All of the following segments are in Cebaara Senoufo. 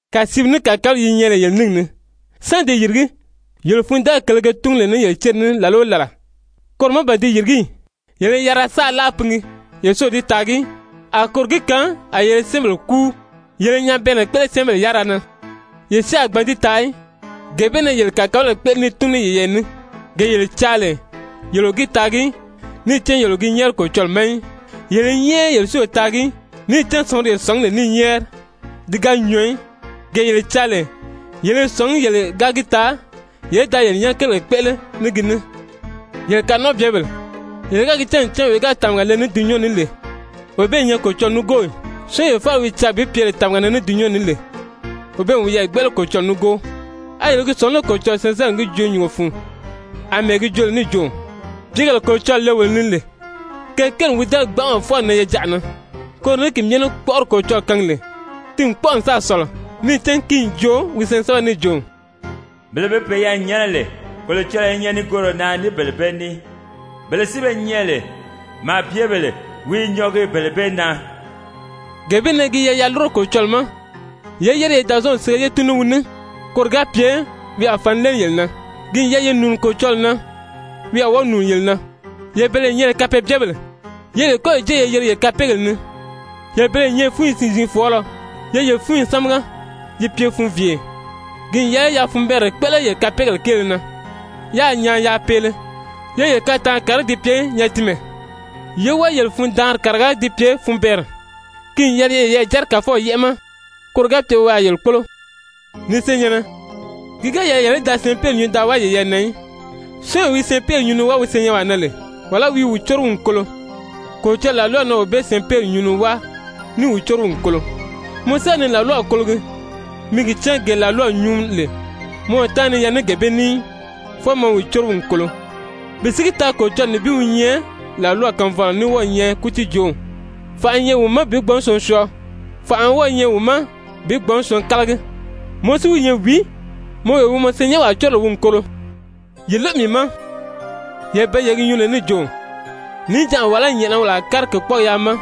Kàsiiw ní kàkabalayi yi nyɛ lè yele níngi ni, sán di yìrigí? Yele fundaayi kèlē ge túngu lè yele céri ni làla o làla, koro má ban di yìrigí ì? Yele i yarira saʔa láa pingi yele si o di taagi í. A koro gi kaan a yele i syɛ́ɛnbèle kúu. Yele i nyabɛɛnnɛ kpéʔele syɛ́ɛnbèle yárira na, yele si a gbǎn di taa í, gee bee na yele kàkabalayi kpéʔele ní i túngu ní yeyɛɛ ní, gee yele caa lè, yele o gi taagi í, níì cán yele o gi nyɛ́ɛri Kolocɔlɔɔ ma í. Yele i nyɛ́ɛri yele si o taagi í, níì cán sɔ̀nguri yele sɔ̀ngí lè ní i nyɛ́ɛri, ti ga nyɔɔ í, gee yele caa lè, yele i sɔ̀ngí yele ga gi taa yele í da yele nyɛ́nɛ kérigèle kpéʔele ní gi ní. Yele kanɔnʔɔbyebèle! Yele ga gi cán ncan wee wi ga tàmaga le ní dulunyanw ní lè, wee bee i nyɛ Kolocɔlɔɔ nígoo ì? Syɔ́ɔnwee faala wi caa bi pye tàmaga na ní dulunyanw ní lè, wee bee n wiyɛɛ gbéʔele Kolocɔlɔɔ nígoo. A yele i gi sɔ̀ngí lé Kolocɔlɔɔ syɛɛnsɛbɛri n gi joo nyùngo fun, àmɛɛ gi joo lè níì jo: «Pìígèle Kolocɔlɔɔ le wolo ni lè, ke kéeli n wi dɛ́nɛ gbanʔama fwɔɔ n nan yejaʔa na?» Koro ní ki myɛ ní kpɔ́ʔɔri Kolocɔlɔɔ kaangi lè, ti n kpɔ́ʔɔ n sáà sɔ̀lɔ, níì cán ki n joo wi syɛɛnsɛbɛri ni níì jo: «Bele be peyɛɛ nyɛ́nɛ lè, Kolocɔlɔɔ i nyɛ nigooro na ní bele bee ní, bele si be nyɛ lè, màabyebèle wi i nyɔɔgi bele bee na.» Gee bee na gi yɛlɛ yaa lúro Kolocɔlɔɔ ma, yé yére ye Dàzɔɔnw sige ye tun ní wi ní, koro ga pye wi a fǎn léeli yele na. Ki n yɛlɛ ye nùuni Kolocɔlɔɔ na, wi a wɔ́ɔ nùuni yele na. Yele bele ye nyɛ lè kapeebyebèle, ye yele kɔ́yi jée ye yirige yele kapeegèle ni, yele bele ye nyɛ lè fúnyi siin-ziin fɔɔlɔ, ye yele fúnyi sámaga yi pye funviiye. Ki n yɛlɛ yaa funbɛɛnrɛ kpéʔele yele kapeegèle kéele na, yáā nyaan yaa peele. Ye yele kataanri kàriga ti pye nyatinmɛ, yé wɔ́ɔ yele fundaanri kàriga ti pye funbɛɛnrɛ. Ki n yɛlɛ ye yeyɛɛ jɛ́rɛ Kàfɔw yɛ́ʔɛ ma, koro ga pye wi a yele kpólo. Ni senyɛ̀nnɛ, ki ga yɛlɛ yele í da syɛɛnpeeri nyuu da wáa yeyɛɛ na í. Syɔ́ɔnwee wi syɛɛnpeeri nyuu ni wáa wi senyɛnwaa na lè, wàlá wi i wi córo wi n kolo, Kolocɔlɔɔ làlwaw na wee bee syɛɛnpeeri nyuu ni wáa ní i wi córo wi n kolo. Mɔ si ga ni làlwaw kologi, mi gi cán gee làlwaw nyuu lè, mɔ o táanri ni yɛlɛgi ní gee bee ní í, fwɔɔ mɔ i wi córo wi n kolo. Bi si gi taa Kolocɔlɔɔ nibin wi nyɛ làlwaw kaanfɔlɔ ní wɔ́ɔ i nyɛ kútiijoow, fànʔa i nyɛ wi ma bi gbǎn syɔɔn syɔɔ, fànʔa wɔ́ɔ i nyɛ wi ma bi gbǎn syɔɔn kálagi. Mɔ si wi nyɛ wìí, mɔ wee wi mɔ syɛɛnnyɛnwaa córo lè wi n kolo? Ye lóʔo mii ma, yele bele ye gi nyuu lè níì jo: «Níjanʔa wàlá nyɛ̀ʔɛna wolo a kári kèkpɔɔgi yaa ma,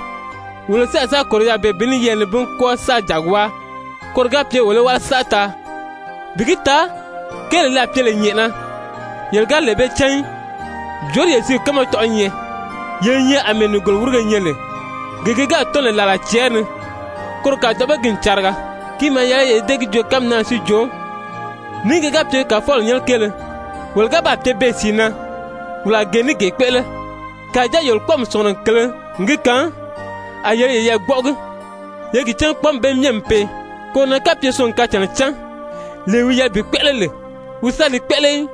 wolo si a sa kòro yaà beè bi yɛɛlɛ nibin kwɔ́ɔ sáā jàgi wáa, koro ga pye wolo í wáli saʔa taa!» Bi gi taa kéelee li a ba pye lè nyɛ̀ʔɛna, yele ga lee bee cán í! Jòorí yele sìíw kánma tɔ̀ʔɔ́ nyɛ? Yele i nyɛ àmɛɛ nìgolowirige nyɛ lè, gee gi gáà tɔ́n lè làla cɛɛri ni, koro kàdoʔo ma ki n cariga. Ki maa yɛlɛ yele í dée gi joo kánmi naa na si jo: «Ní ki ga pye Kàfɔw nyɛ́nɛ kéele, wolo ga baa pye beè sìi na, wolo a gee ní gee kpéʔele.» Kàjáa yele kpɔ́ɔmi sɔ̀ngurɔ kèlē n gi kaan, a yele i yeyɛɛ gbɔ́ʔɔgi. Ye gi cán kpɔ́ɔmi bee myɛ n pee. Koro na kapye syɔɔn n kacànnaa cán, lee wi yɛlɛ bi kpéʔele lè, wi si ga li kpéʔele í,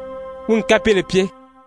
wi n kapeele pye.